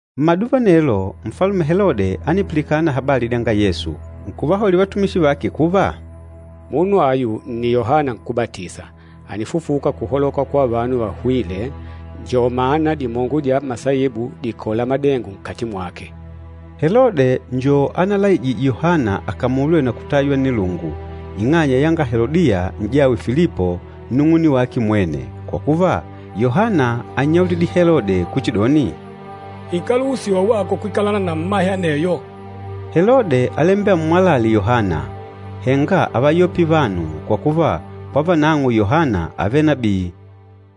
Mmaduva anelo, Nfalume Helode ánipilikana habali dyanga Yesu. Nkuvahaulila vatumishi vake, “Munu ayu nni Yohana Nkúbatisa, ànifufuka kuhaloka kwa vanu vahwîle, njo mana dimongo dya masaibu dìkola madengo nkati mwake.” Helode njo analaijîje Yohana akamulwe na kutaywa nnilungu, ing'anya yanga Helodiya, n'jawe Filipo, nnung'une wake mwene. Kwa kuva, Yohana ánnyaulidile Helode kuchidoni, “Ikáluhusiwa wako kwikalana na mmahe aneyo!” Helode álembela ammwalale Yohana, henga ávayopile vanu, kwa kuva, kwa vanang'o Yohana ávele nabii.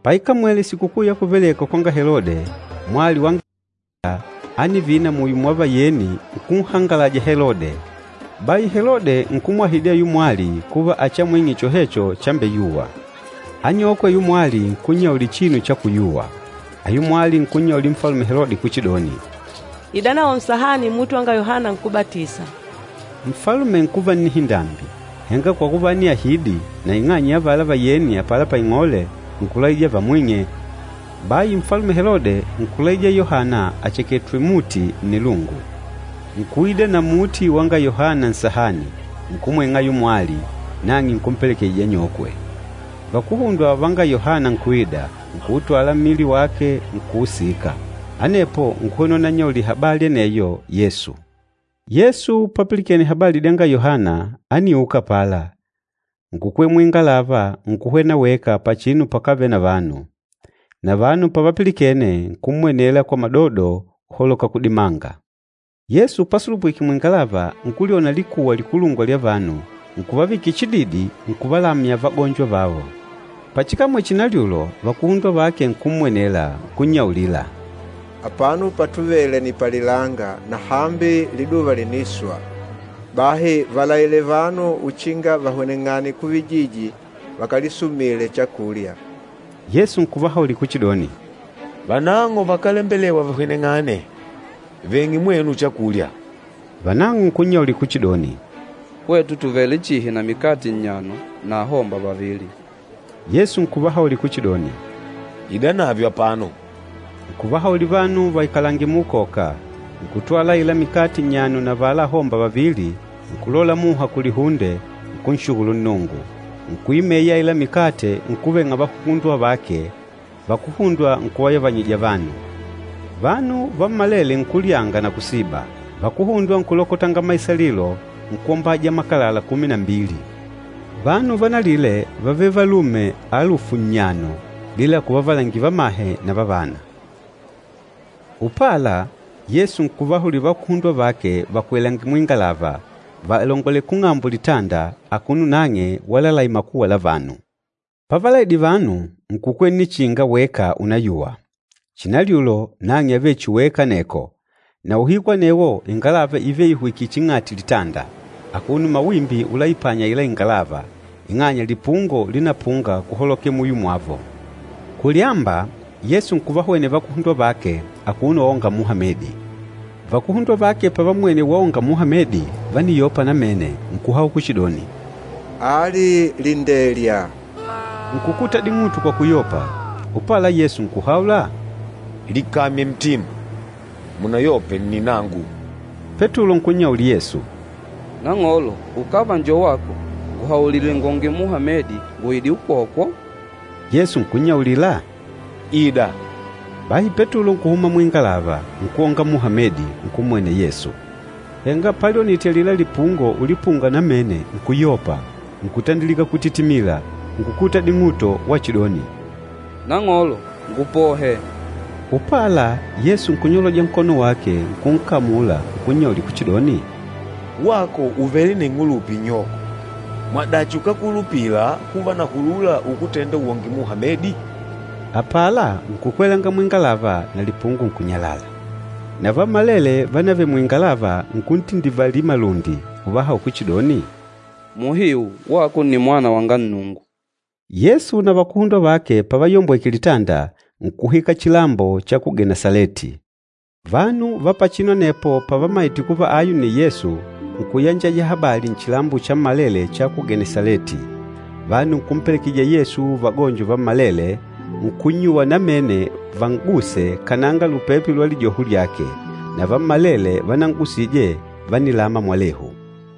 Paikamwele sikukuu ya kuvelekwa kwanga Helode, mwali wanga Helodiya ánivina muyo mwa vayeni nkunhangalaja Helode. Bahi Helode nkumwahidi ayula mwali kuva achiamwing'e chohecho chambeyuwa. Anyokwe ayula mwali nkunnyaulila chinu chakuyuwa. Ayula mwali nkunnyaulila Nfalume Helode kuchidoni, “Idanawo nsahani muti wanga Yohana Nkúbatisa.” Nfalume nkuva nnihindambi, henga kwa kuva ániahidi na ing'anya ya avala vayeni apala paing'ole, nkulaija vamwing'e. Bahi Nfalume Helode nkulaija Yohana acheketwe muti nnilungu. Nkuida na muti wanga Yohana nsahani, nkumwing'a ayula mwali, nang'e nkumpelekejija anyokwe. Vakuhundwa vanga Yohana nkuida, nkuutwala mmili wake, nkuusika. Anepo, nkuhwena unannyaulila habali aneyo Yesu. Yesu papilikene habali dyanga Yohana, ániuka apala, nkukwela muingalava, nkuhwena weka pachinu pakávele na vanu. Na vanu pavapilikene, nkummwenela kwa madodo uholoka kudimanga. Yesu pasulupwike muingalava, nkulyona likuwa likulungwa lya vanu, nkuvavikila chididi, nkuvalamya vagonjo vavo. Pachikamwele chinalyulo, vakuhundwa vake nkummwenela, nkunnyaulila, “Apano patuvele ni palilanga na hambi liduva lìniswa. Bahi valaile vanu uchinga vahweneng'ane kuvijiji vakalisumile chakulya.” Yesu nkuvahaulila kuchidoni, “Vanang'o vakálembelewa vahweneng'ane. Veng'e mwenu chakulya.” Vanang'o nkunnyaulila kuchidoni, “Hwetu tùvele chihi na mikate nnyano na ahomba vavili.” Yesu nkuvahaulila kuchidoni, “Idanavyo apano.” Nkuvahaulila vanu vaikalange muukoka. Nkùtwala aila mikate nnyano na avala ahomba vavili, nkulola muha kulihunde, nkunshukulu Nnungu. Nkuimeyanya aila mikate, nkuveng'a vakuhundwa vake, vakuhundwa nkuvayavanyija vanu. Vanu vammalele nkulyanga na kusiba. Vakuhundwa nkulokotanga maisalilo, nkwombaja makalala kumi na mbili. Vanu vanalile vávele valume alufu nnyano, bila kuvavalangila vamahe na vavana. Upala, Yesu nkuvahaulila vakuhundwa vake vakwelange muingalava, valongolele kung'ambo litanda, akuno nang'e walalaila makuwa la vanu. Pávalaidile vanu, nkukwela nnichinga weka unayuwa. Chinalyulo, nang'e ávele chihi weka aneko, na uhiku anewo ingalava ívele ihwikìlè ching'ati litanda, akuno mawimbi ulaipanya aila ingalava, ing'anya lipungo linapunga kuholokela muyo mwavo. Kulyamba, Yesu nkuvahwenela vakuhundwa vake akuno waonga muha medi. Vakuhundwa vake pavammwene waonga muha medi, vániyopa namene, nkuhaula kuchidoni, “Ali lindelya!” Nkukuta ding'uto kwa kuyopa. Upala, Yesu nkuhaula, “Likamye ntima, munayope nni nangu!” Petulo nkunnyaulila Yesu, “Nang'olo, ukava njo wako, nguhaulile ngwonge muha medi nguide ukwokwo.” Yesu nkunnyaulila, “Ida.” Bahi Petulo nkuhuma muingalava, nkwonga muha medi, nkummwenela Yesu. Henga palyonite alila lipungo ulipunga namene nkuyopa, nkutandilika kutitimila, nkukuta ding'uto wachidoni, “Nang'olo, ngupohe!” Upala, Yesu nkunyoloja nkono wake, nkunkamula nkunnyaulila kuchidoni, “Wako ùvele na ing'ulupa inyoko. Mwadachi, ukákulupila kuva nahulula ukutenda wonge muha medi?” Apala, nkukwelanga muingalava na lipungo nkunyalala. Na vammalele vánavèlè muingalava nkuntindivalila malundi, nkuhaula kuchidoni, “Muhiu wako nni Mwana wanga Nnungu.” Yesu na vakuhundwa vake pavayombweke litanda, nkuhwika chilambo cha ku Genesaleti. Vanu va pachinu anepo pavammaite kuva ayu nni Yesu, nkuyanjaja habali nchilambo chammalele cha ku Genesaleti. Vanu nkumpelekejija Yesu vagonjo vammalele, nkunnyuwa namene van'guse kananga lupepe lwa lijoho lyake. Na vammalele vanan'gusije vánilama mwalehu.